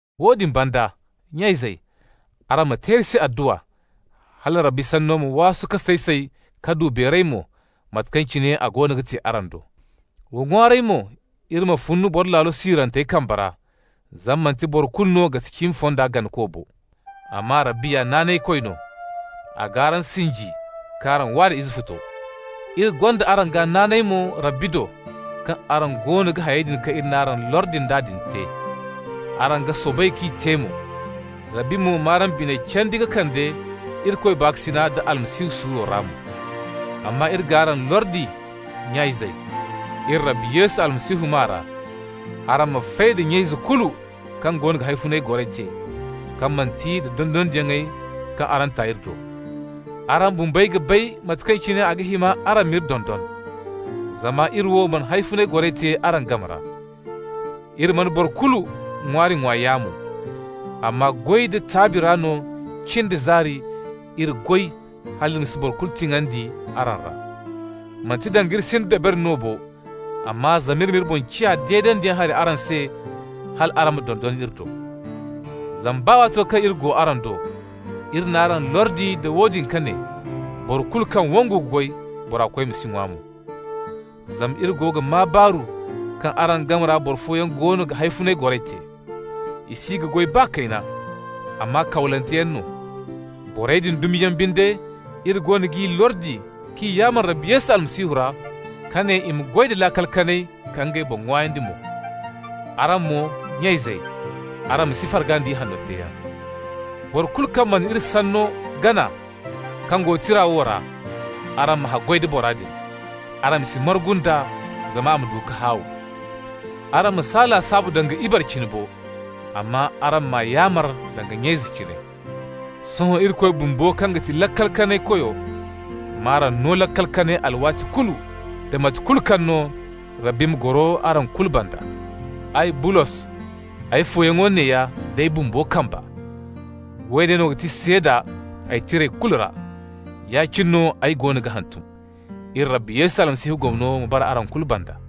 Woodin banda, nya-izey, araŋ ma te iri se adduwa, hala Rabbi sanno ma waasu ka say-say ka du beeray mo, mate kaŋ cine a goono ga te araŋ do. Wa ŋwaaray mo iri ma fun boro laalo siirantey kambe ra, zama manti boro kulu no ga ti cimi fonda ganakoyaŋ bo. Amma Rabbi ya naanaykoy no. A g'araŋ sinji k'araŋ wa da Izefuto. Iri gonda araŋ gaa naanay mo Rabbi do kaŋ araŋ goono ga hayey kaŋ iri n'araŋ lordi nd'a din te, araŋ ga soobay k'i te mo. Rabbi mo m'araŋ biney candi ka kande Irikoy baakasina da Almasihu suuro ra mo. Amma iri g'araŋ lordi, nya-izey, iri Rabbi Yesu Almasihu maa ra, araŋ ma fay da nya-ize kulu kaŋ goono ga hawfunay goray te, kaŋ manti nda dondonandiyaŋey kaŋ araŋ ta iri do. Araŋ bumbey ga bay mate kaŋ cine a ga hima araŋ m'iri dondon. Zama iri wo mana hawfunay goray te araŋ game ra. Iri mana boro kulu ŋwaari ŋwa yaamo. Amma goy da taabi ra no cin da zaari iri goy hal iri ma si boro kulu tiŋandi araŋ ra. Manti danga iri sinda dabari no bo, amma zama iri m'iri boŋ ciya deedandiyaŋ hari araŋ se, hal araŋ ma dondon iri do. Zama baa waato kaŋ iri go araŋ do, iri n'araŋ lordi nda woodin ka ne: boro kulu kaŋ wangu ka goy, bora koy ma si ŋwa mo. Zama iri go ga maa baaru kaŋ araŋ game ra boro fooyaŋ goono ga hawfunay goray te. I si ga goy baa kayna, amma kawlanteyaŋ no. Borey din dumi yaŋ binde iri goono g'i lordi k'i yaamar Rabbi Yesu Almasihu ra, ka ne i ma goy da laakal kanay ka ngey boŋ ŋwaayandi mo. Araŋ mo, nya-izey, araŋ ma si farga nda ihanno teeyaŋ. Boro kulu kaŋ mana iri sanno gana kaŋ go tira wo ra, araŋ ma haggoy da bora din, araŋ ma si margu nd'a zama a ma du ka haaw. Araŋ ma s'a lasaabu danga ibare cine bo, amma araŋ m'a yaamar danga nya-ize cine. Sohõ Irikoy bumbo, kaŋ ga ti Laakal-Kanay-Koy m'araŋ no laakal kanay alwaati kulu da mate kulu kaŋ no. Rabbi ma goro araŋ kulu banda. Ay, Bulos, ay fooyaŋo neeya d'ay bumbo kamba. Woone no ga ti seeda ay tirey kulu ra. Ya-cine no ay goono ga hantum. Iri Rabbi Yesu Almasihu gomno ma bara araŋ kulu banda.